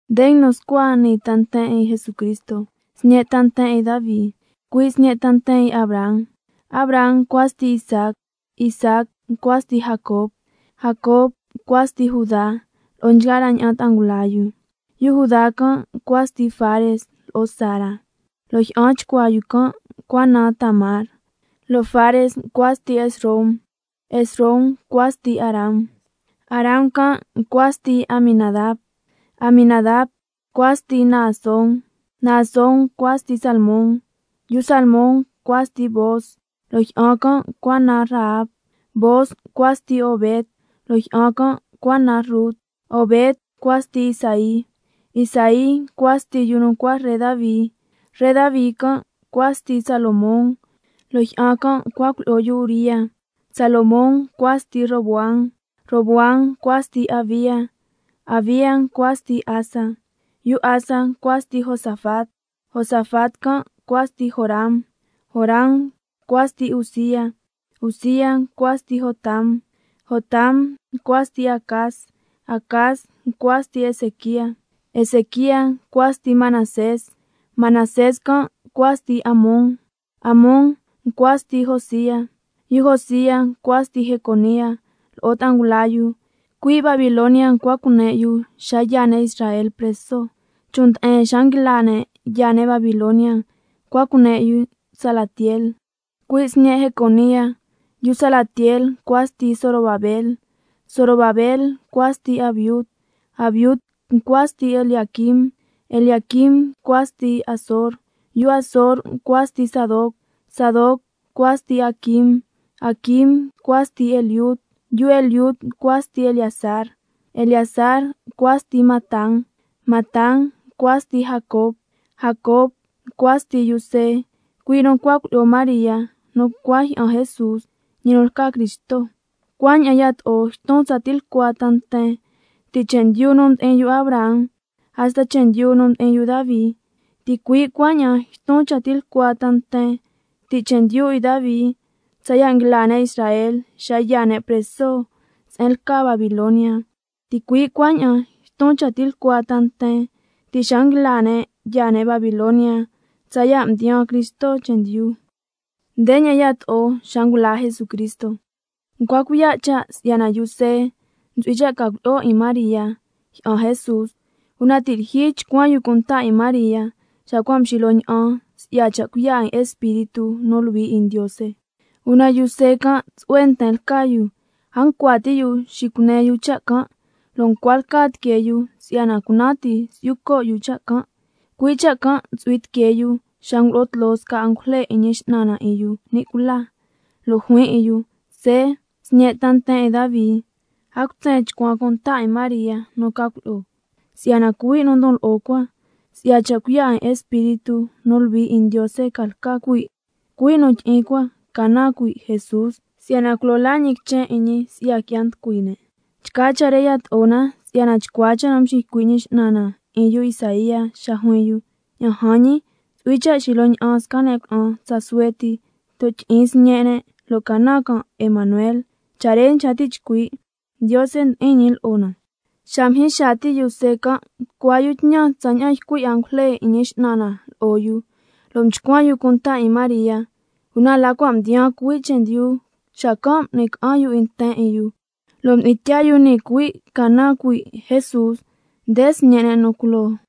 Nde nguinu scua nii ta nten 'in Jesucristo, sñe' ta nten 'in Davi, cui' sñe' ta nten 'in Abraham. Abraham ncua sti Isaac, Isaac ncua sti Jacob, Jacob ncua sti Judá lo'o nchgaa la ña'an ta'a ngula yu. Yu Judá can' ncua sti Fares lo'o Zara, lo' jyi'an chcuaa yu can' ncua naan Tamar, lo' Fares ncua sti Esrom, Esrom ncua sti Aram. Aram can' ncua sti Aminadab, Aminadab ncua sti Naasón, Naasón ncua sti Salmón. Yu Salmón ncua sti Booz, lo' jyi'an can' ncua naan Rahab, Booz ncua sti Obed, lo' jyi'an can' ncua naan Rut, Obed ncua sti Isaí. Isaí ncua sti yu nu ncua ree Davi, ree Davi can' ncua sti Salomón, lo' jyi'an can' ncua cuilyi'o yu Uría. Salomón ncua sti Roboam, Roboam ncua sti Abía, Abía ncua sti Asa. Yu Asa ncua sti Josafat, Josafat can' ncua sti Joram, Joram ncua sti Uzía. Uzía ncua sti Jotam, Jotam s ncua sti Acaz, Acaz ncua sti Ezequía. Ezequía ncua sti Manasés, Manasés can' ncua sti Amón, Amón ncua sti Josía. Yu Josía ncua sti Jeconía lo'o ta'a ngula yu, cui' Babilonia ncua cune' yu xa yaa ne' Israel preso. Chon' nde'en xa nguila ne' yaa ne' Babilonia ncua cune' Salatiel, cui' sñe' Jeconía, yu Salatiel ncua sti Zorobabel, Zorobabel ncua sti Abiud, Abiud ncua sti Eliaquim, Eliaquim ncua sti Azor. Yu Azor ncua sti Sadoc, Sadoc ncua sti Aquim, Aquim ncua sti Eliud. Yu Eliud ncua sti Eleazar, Eleazar ncua sti Matán, Matán ncua sti Jacob. Jacob ncua sti yu See, cui' nu ncua cuilyi'o María nu ncua jyi'an Jesús, ñi nu lca Cristo. Cuaña'an yato'o yton tsa tilcua ta nten, ti' chendyu nu mdi'in yu Abraham hasta chendyu nu mdi'in yu Davi, ticui' cuaña'an yton cha tilcua ta nten, ti' chendyu 'in Davi tsaya' nguila ne' Israel yaa ne' preso se'en lca Babilonia, ticui' cuaña'an yton cha tilcua ta nten, ti' xa nguila ne' yaa ne' Babilonia tsaya' mdiyaan Cristo chendyu. Ndeña'an yato'o xa ngula Jesucristo: Ncua cuiya' cha' si'yana yu See ntsu'hui cha' ca cuilyi'o 'in María, jyi'an Jesús, una ti' lyijyi chcuan yu cunta 'in María, xa cua' mxilyo ña'an si'ya cha' cuiya' 'in Espíritu nu Luhui 'in Ndiose. Una yu See can' tsu'hue nten lca yu, a ncua ti' yu xicune yu cha' can', lo' ncua lca tiquee yu si'yana cunan ti si'yu co' yu cha' can'. Cui' cha' can' ntsu'hui tiquee yu, xa ngulo'o tloo sca angujle 'in Ñi X'nan na 'in yu ni' cula, lo' juin 'in yu: See, sñe' ta nten 'in Davi, a cutsen chcuan cunta 'in María nu ca cuilyi'o, si'yana cuhui' nu ndon lo'o cua, si'ya cha' cuiya' 'in Espíritu nu Luhui 'in Ndiose ca lca cuhui'. Cuhui' nu tyi'in cua ca naan cuhui' Jesús, si'yana culo laa ñi quichen 'in ñi si'ya qui'ya nducui ne'. Nchgaa cha' re yato'o na, si'yana chcua cha' nu mxiycui' Ñi X'nan na 'in yu Isaía xa juin yu: —Ña'an jan ñii, ntsu'hui cha' xilyo ña'an sca ne' cuna'an tsa suhue ti lo' tyi'in sñe' ne', lo' ca naan can' Emanuel—. Cha' re nchca ti' chcui', Ndiose ndi'in lo'o na. Xa mjyin xaa ti' yu See can', mducua yu tñan tsaña'an ycui' angujle 'in Ñi X'nan na lo'o yu, lo' mchcuan yu cunta 'in María. Una la cua' mdiyaan cuhui' chendyu xacan' m'ni ca'an yu 'in nten 'in yu, lo' mdi'in tyaa yu nii cuhui' ca naan cuhui' Jesús, nde sñe' ne' nu culoo.